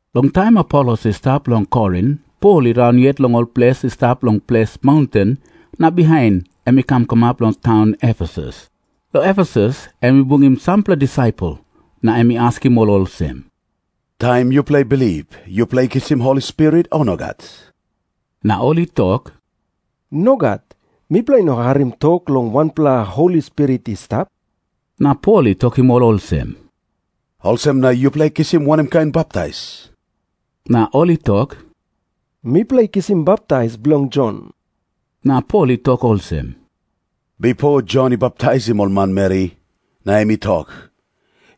Long taim Apolos i stap long Korin, Pol i raun yet long ol ples i stap long ples maunten na bihain em i kam kamap long taun Efesus. Long Efesus em i bungim sampela disaipel na em i askim ol olsem, "Taim yupela i bilip, yupela i kisim Holi Spirit, o nogat?" Na ol i tok, "Nogat. Mipela i no harim tok long wanpela Holi Spirit i stap." Na Pol i tokim ol olsem, "Olsem na yupela i kisim wanem kain baptais?" Na ol i tok, "Mipela i kisim baptais bilong Jon." Na Pol i tok olsem, "Bipo Jon i baptaisim ol manmeri, na em i tok,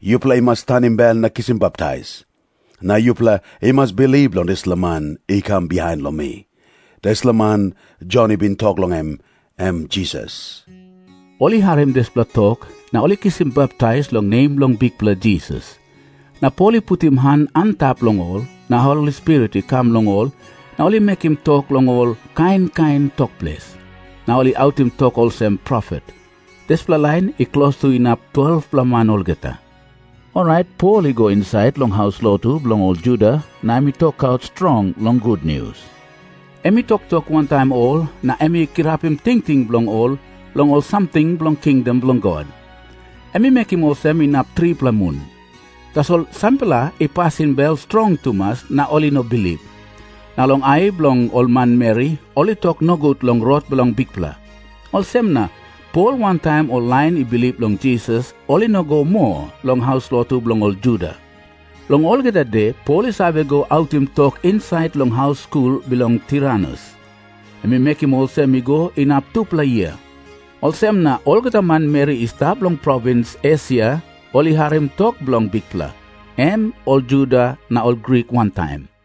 'Yupela i mas tanim bel na kisim baptais. Na yupela i mas bilip long dispela man i kam bihain long mi.' Dispela man Jon i bin tok long em, em Jisas." Ol i harim dispela tok, na ol i kisim baptais long nem bilong Bikpela Jisas. Na Pol i putim han antap long ol, na Holi Spirit i kam long ol, na ol i mekim tok long ol kain kain tok ples, na ol i autim tok olsem profet. Dispela lain i klostu inap 12-pela man olgeta. Orait Pol i go insait long haus lotu bilong ol Juda na em i tokaut strong long gutnius. Em i toktok wantaim ol na em i kirapim tingting bilong ol long ol samting bilong kingdom bilong God. Em i mekim olsem inap tripela mun. Tasol sampela i pasim bel strong tumas na ol i no bilip. Na long ai bilong ol manmeri ol i tok nogut long Rot bilong Bikpela. Olsem na Pol wantaim ol lain i bilip long Jisas, ol i no i go moa long haus lotu bilong ol Juda. Long olgeta de Pol i save go autim tok insait long haus skul bilong Tiranus. Em i mekim olsem i go inap tupela yia. Olsem na olgeta manmeri i stap long provins Esia ol i harim tok bilong Bikpela, em ol Juda na ol Grik wantaim.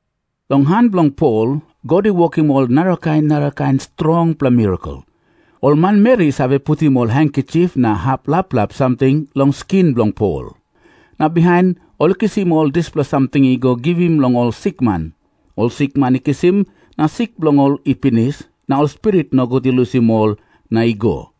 Long han bilong Pol, God i wokim ol narakain narakain strongpela mirakel. Ol manmeri i save putim ol hankisip na hap laplap samting long skin bilong Pol, na bihain ol i kisim ol dispela samting i go givim long ol sikman. Ol sikman i kisim, na sik bilong ol i pinis, na ol spirit nogut i lusim ol na i go.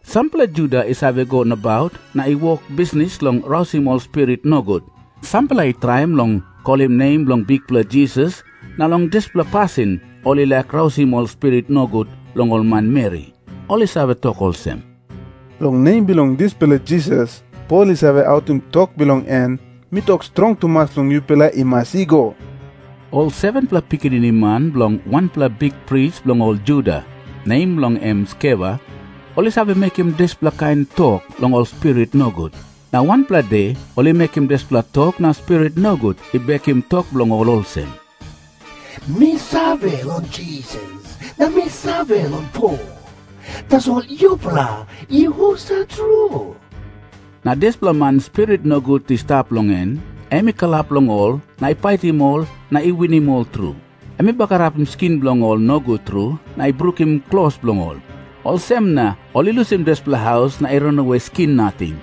Sampela Juda i save go nabaut na i wok bisnis long rausim ol spirit nogut. Sampela i traim long kolim nem bilong Bikpela Jisas na long dispela pasin ol i laik rausim ol spirit nogut long ol manmeri. Ol i save tok olsem, "Long nem bilong dispela Jisas, Pol i save autim tok bilong en, mi tok strong tumas long yupela i mas i go." Ol 7-pela pikinini man bilong wanpela bikpris bilong ol Juda, nem bilong en Skeva, ol i save mekim dispela kain tok long ol spirit nogut. Na wanpela de ol i mekim dispela tok na spirit nogut i bekim tok bilong ol olsem, "Mi save long Jisas na mi save long Pol. Tasol yupela i husat tru?" Na dispela man spirit nogut i stap long en, em i kalap long ol, na i paitim ol na i winim ol tru. Em i bagarapim skin bilong ol nogut tru, na i brukim klos bilong ol. Olsem na ol i lusim dispela haus na i ranawe skin nating.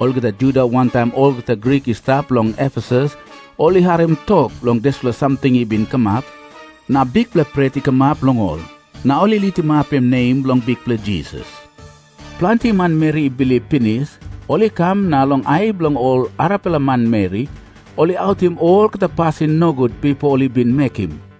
Olgeta Juda wantaim olgeta Grik i stap long Efesus ol i harim tok long dispela samting i bin kamap, na bikpela pret i kamap long ol. Na ol i litimapim nem bilong Bikpela Jisas. Planti manmeri i bilip pinis, ol i kam na long ai bilong ol arapela manmeri, ol i autim olgeta pasin nogut bipo ol i bin mekim.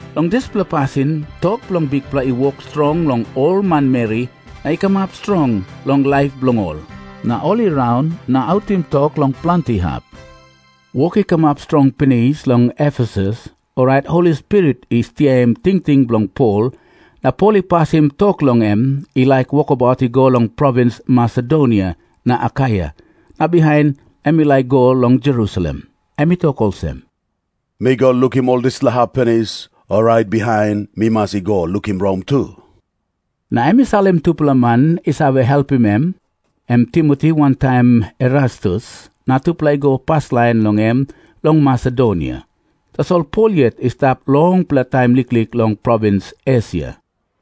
Long dispela pasin tok bilong Bikpela i wok strong long ol manmeri, na i kamap strong long laip bilong ol. Na ol i raun na autim tok long planti hap. Wok i kamap strong pinis long Efesus, orait Holi Spirit i stiaim tingting bilong Pol, na Pol i pasim tok long em i laik wokabaut i go long provins Masedonia na Akaia na bihain em i laik i go long Jerusalem. Em i tok olsem, "Mi go lukim ol dispela hap pinis, orait bihain mi mas i go lukim Rom tu." Na em i salim tupela man i save helpim em, em Timoti wantaim Erastus, na tupela i go paslain long em long Masedonia. Tasol Pol yet i stap longpela taim liklik long provins Esia.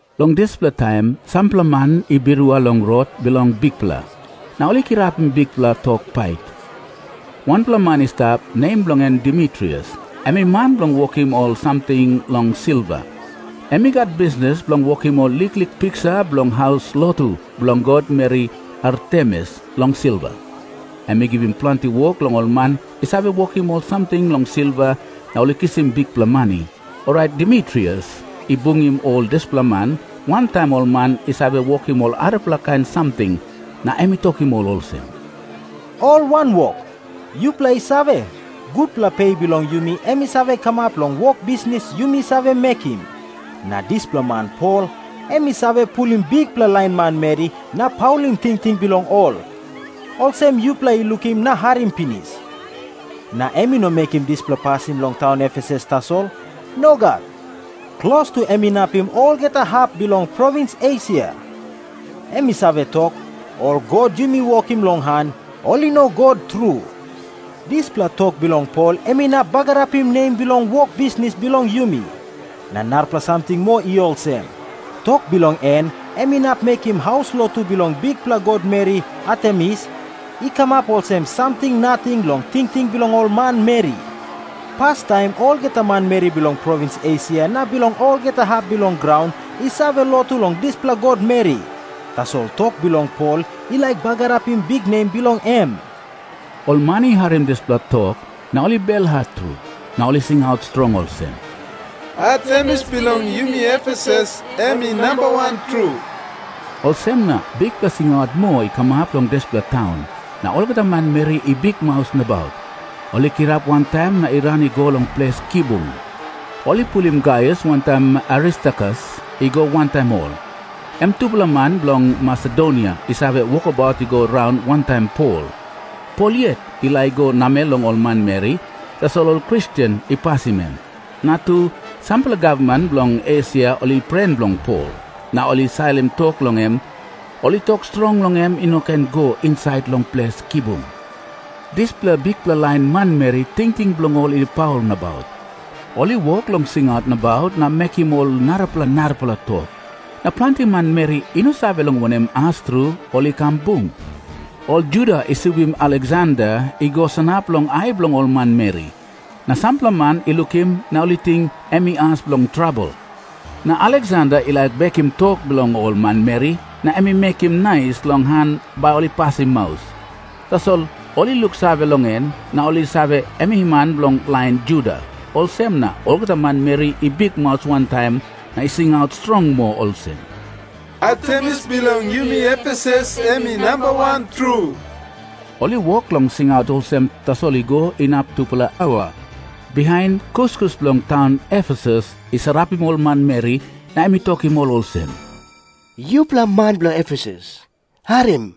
Long dispela taim sampela man i birua long Rot bilong Bikpela na ol i kirapim bikpela tok pait. Wanpela man i stap, nem bilong en Demitrius, em i man bilong wokim ol samting long silva. Em i gat bisnis bilong wokim ol liklik piksa bilong haus lotu bilong god meri Artemis long silva. Em i givim planti wok long ol man i save wokim ol samting long silva na ol i kisim bikpela mani. Orait Demitrius i bungim ol dispela man, wantaim ol man i save wokim ol arapela kain samting, na em i tokim ol olsem, "Ol wanwok, yupela i save, gutpela pe bilong yumi em i save kamap long wok bisnis yumi save mekim. Na dispela man Pol em i save pulim bikpela lain manmeri na i paulim tingting bilong ol, olsem yupela i lukim na harim pinis. Na em i no mekim dispela pasin long taun Efesus tasol. Nogat. Klostu em inapim olgeta hap bilong provins Esia. Em i save tok, 'Ol god yumi wokim long han, ol i no god tru.' Dispela tok bilong Pol em inap bagarapim nem bilong wok bisnis bilong yumi. Na narapela samting moa i olsem. Tok bilong en em inap mekim haus lotu bilong bikpela god meri Artemis i kamap olsem samting nating long tingting bilong ol manmeri. Pastaim olgeta manmeri bilong provins Esia na bilong olgeta hap bilong graun i save lotu long dispela god meri. Tasol tok bilong Pol i laik bagarapim biknem bilong em." Ol man i harim dispela tok, na ol i belhat tru. Na ol i singaut strong olsem, "Artemis bilong yumi Efesus em i nambawan tru." Olsem na bikpela singaut moa i kamap long dispela taun, na olgeta manmeri i bikmaus nabaut. Ol i kirap wantaim na i ran i go long ples kibung. Ol i pulim Gaius wantaim Aristarkus i go wantaim ol, em tupela man bilong Masedonia i save wokabaut i go raun wantaim Pol. Pol yet i laik i go namel long ol manmeri, tasol ol Kristen i pasim em. Na tu, sampela gavman bilong Esia ol i pren bilong Pol, na ol i salim tok long em. Ol i tok strong long em i no ken i go insait long ples kibung. Dispela bikpela lain manmeri, tingting bilong ol i paul nabaut. Ol i wok long singaut nabaut na mekim ol narapela narapela tok. Na planti manmeri i no save long wanem as tru ol i kam bung. Ol Juda i subim Aleksander i go sanap long ai bilong ol manmeri, na sampela man i lukim na ol i ting em i as bilong trabel. Na Aleksander i laik bekim tok bilong ol manmeri na em i mekim nais long han bai ol i pasim maus. Tasol ol i luksave long em, na ol i save, em i man bilong lain Juda. Olsem na olgeta manmeri i bikmaus wantaim na i singaut strong moa olsem, "Artemis bilong yumi Efesus em i nambawan tru." Ol i wok long singaut olsem tasol i go inap tupela aua. Bihain kuskus bilong taun Efesus i sarapim ol manmeri, na em i tokim ol olsem, "Yupela man bilong Efesus, harim.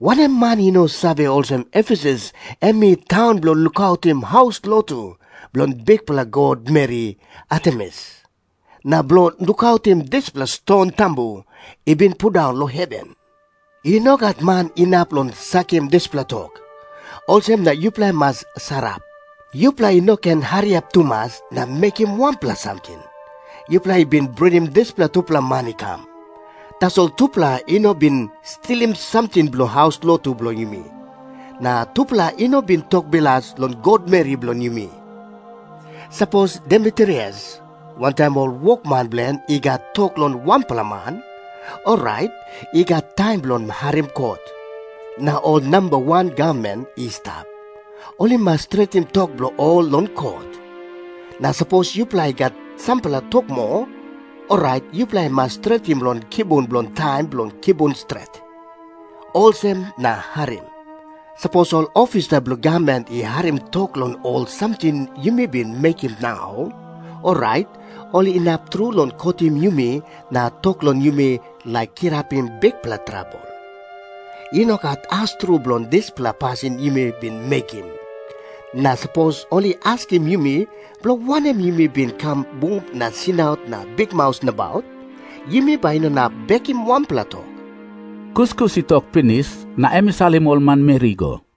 Wanem man i no save olsem Efesus em i taun bilong lukautim haus lotu bilong bikpela god meri Artemis, na bilong lukautim dispela ston tambu i bin pundaun long heven? I no gat man inap long sakim dispela tok. Olsem na yupela i mas sarap. Yupela i no ken hariap tumas na mekim wanpela samting. Yupela i bin bringim dispela tupela man i kam. Tasol tupela i no bin stilim samting bilong haus lotu bilong yumi. Na tupela i no bin tok bilas long god meri bilong yumi. Sapos Demitrius wantaim ol wokman bilong en i gat tok long wanpela man, orait i gat taim bilong harim kot. Na ol namba wan gavman i stap. Ol i mas stretim tok bilong ol long kot. Na sapos yupela i gat sampela tok moa, orait yupela i mas stretim long kibung long taim bilong kibung stret. Olsem na harim. Sapos ol ofisa bilong gavman i harim tok long ol samting yumi bin mekim nau, orait ol inap tru long kotim yumi na tok long yumi laik kirapim bikpela trabel. I no gat as tru bilong dispela pasin yumi bin mekim. Na sapos ol i askim yumi bilong wanem yumi bin kam bung na singaut na bikmaus nabaut, yumi bai i no inap bekim wanpela tok." Kuskus i tok pinis, na em i salim ol manmeri i go.